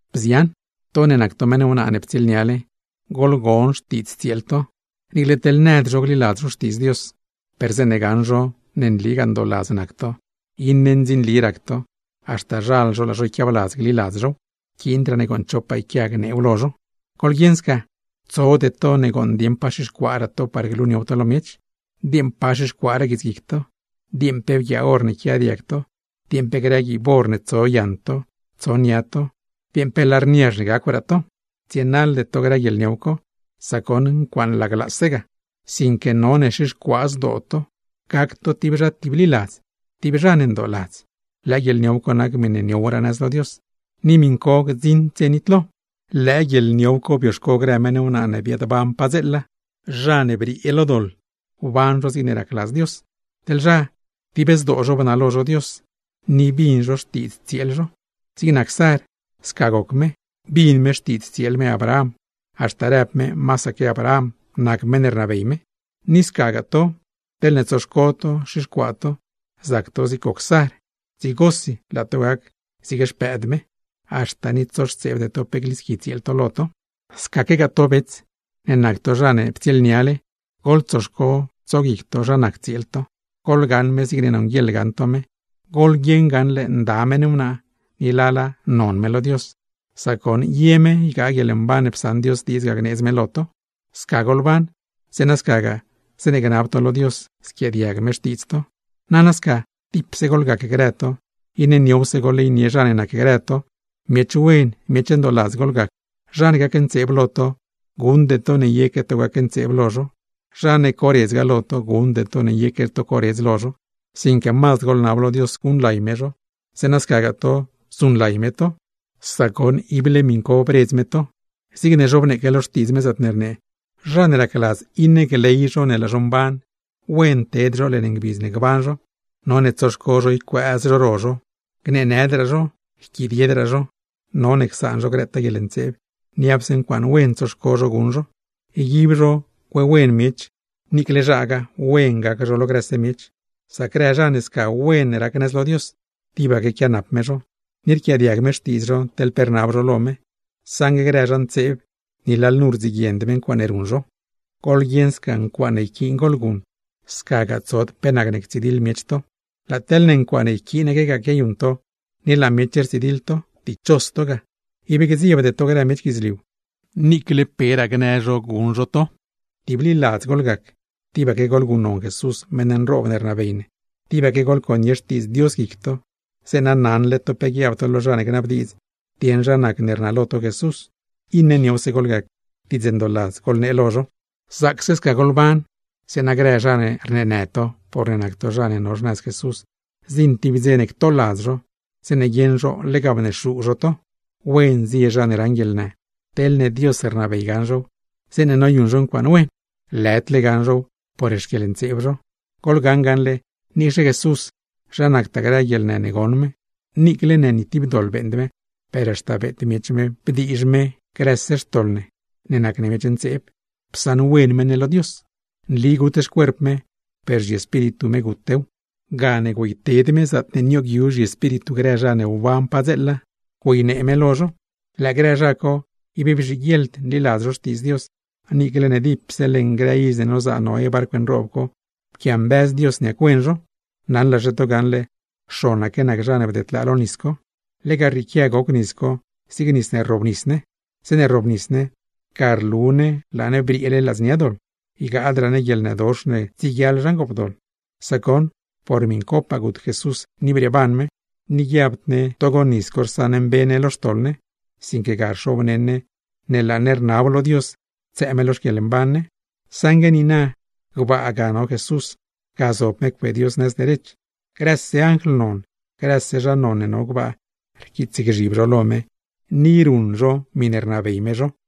Bzian, to ne nac to meṉ wnaa ne ptsieelniale, goḻgon xtiidz tsieel to. Niicle teḻ nëd zho gliladz zho Xtiidz Dios, per zeeṉe gaṉ zho ne nligaa ndooladz nac to, iṉe ndzinli rac to, haxta zhal zho laa zho yquiabladz gliladz zhow. Yquiindraa ne gooṉ chopaa yquia gneew lo zho. Goḻguieṉ sca, tsode to ne gooṉ dieṉ pa xixcuaaraa to par gluniow to lo miech; dieeṉ pa xixcuaaraa guitsguic to, dieeṉ pe bguiaa or ne yquia diag to, dieeṉ pe grë guiib or tso yaṉ to, tso nia to, dieeṉ pe lar niazh ne gacwraa to. Tsienaḻde to grë guieḻniow co, sac goṉ ncuaaṉ laglaase ga; sinque none xixcuaa zdoo to, gac to tib zha tibliladz, tib zha ne ndooladz. Lëë guieḻniow co nac miṉe niowraa nëz lo Dios, ni miṉ co gdziṉd dze nitlo. Lëë guieḻniow co bioxco grë meṉ wnaa ne biaadban padzeela, zha ne briee lo doḻ wban zho zigne racladz Dios; teḻ zha, dib zdoo zho bnalo zho Dios, ni bin zho xtiidz tsieel zho. Zig nac Sar, sca goc me, bin me xtiidz tsieel me Abraham, haxta rëb me masaque Abraham nac meṉ ne rnabey me. Ni scagaa to, teḻne tsoxco to xixcuaa to, zac to zig goc Sar, dzigosi laa to gac zig xpëëd me; haxta ni tsoxtseebde to pe glisqui tsieel to lo to. Scaquegaa to bets, ne nac to zha ne ptsieelniale, goḻtsoxco tsoguic to zha nac tsieel to. Goḻgaṉ me zigne nonguieḻa gaṉ to me, goḻguieṉ gaṉle nda meṉ wnaa; ni lala, non me lo Dios, sac goṉ ye me ygaa guieḻmban ne psaṉ Dios diidz gneedz me lo to. Sca goḻban, zeeṉa scagaa zeeṉe gnab to lo Dios, squiaadiag me xtiidz to. Nana sca, tipse goḻgac grë to. Iṉe niowse goḻleynie zha ne nacgrë to, miech wen, miech ndooladz goḻgac. Zha ne gacntseeb lo to, guṉde to ne yeque to gacntseeb lo zho; zha ne coredzgaa lo to, guṉde to ne yeque to coredz lo zho; sinque mazd goḻnab lo Dios guṉlay me zho, zeeṉa scagaa to, zuṉlay me to; sac goṉ, ible miṉ co bredz me to. Zigne zhobneeque lo Xtiidz me, zaatne rnee: Zha ne racladz iṉe gley zho ne laa zho mban, wen ted zho leṉ ngbidz ne gban zho, none tsoxco zho ycuëëz zho ro zho, gneenëdraa zho, yquidiedraa zho; none csaan zho grëtaa guieḻntseeb, niapse ncuaaṉ wen tsoxco zho guṉ zho, yguib zho cuewen miech, niicle zhagaa wen gac zho lo grëse miech. Sac grë zha ne sca wen rac nëz lo Dios, tibaque quianap me zho, ni rquiaadiag me xtiidz zho teḻ pe rnab zho lo me; saṉgue grë zha ntseeb, ni lalnu rdziguiend me ncuaaṉe ruṉ zho. Goḻguieṉ sca, ncuaaṉe yquiin goḻguṉ; scagaa tsod pe nacne ctsidiḻ miech to. Laa teḻne ncuaaṉe yquiinaquegaa noyuṉ to, ni laa miech rtsidiḻ to, ¡dichos to ga! Ib gdziebde to grë miech guidzliu, niicle peraa gnë zho guṉ zho to. Tibliladz goḻgac, tibaque goḻguṉnon Jesús meṉ nroob ne rnabey ne, tibaque goḻconie Xtiidz Dios guic to, zeeṉa naṉle to pe guiab to lo zha ne gnabdiidz dieṉ zha nacne rnalo to Jesús; iṉe niowse goḻgac, diidz ndooladz goḻnee lo zho. Zaacse sca goḻban, zeeṉa grë zha ne rneenë to porne nac to zha ne no xnëz Jesús, zdziṉ tib dze ne ctoladz zho, zeeṉe guieṉ zho lega bnexuu zho to. Wen zie zha ne raṉ guieḻnë, teḻne Dios rnabey gaṉ zhow zeeṉe noyuṉ zho ncuaaṉ wen; lëdle gaṉ zhow por xquieḻntseeb zho. Goḻgaṉ gaṉle niicxe Jesús, zha nactaa grë guieḻnë ne goṉ me. Niicle ne ni tib doḻ beeṉd me, per haxta beet miech me bdiizh me grëse xtoḻ ne nac ne miech ntseeb, psaṉwen me ne lo Dios. Nli gut xcuerp me, per zhiespíritu me gutew; gane güeyted me zaatne nioogyu zhiespíritu grë zha ne wban padzeela, güeynee me lo zho. Lëë grë zha co ib bzhiguieḻd nliladz Xtiidz Dios, niicle ne dipse leṉ dze ne nozaa Noé barcw nroob co pquiambëz Dios niac-wen zho. Naṉlaxe to gaṉle, xonaque nac zha ne bdedlaa lo nis co. (Lega rrieequia goc nis co zig nis ne rrobnis ne. Zeeṉe rrobnis ne, ga rlu ne laa ne brieele ladznia doḻ, ygaadraa ne guieḻnëdox ne tsieguiaḻ zha ngoopdoḻ, sac goṉ por miṉcopaa gut Jesús ni brieeban me; ni guiabd ne togo nis co rsaṉmbe ne lo xtoḻ ne, sinque ga rxobneṉ ne ne laa ne rnab lo Dios ctsëë me lo xquieḻmban ne.) Saṉgue niina gbaa ga no Jesús, ga zob me cue Dios nëz derech, grëse anjl non, grëse zha non ne no gbaa, rquiitsgzhib zho lo me ni ruṉ zho miṉe rnabey me zho.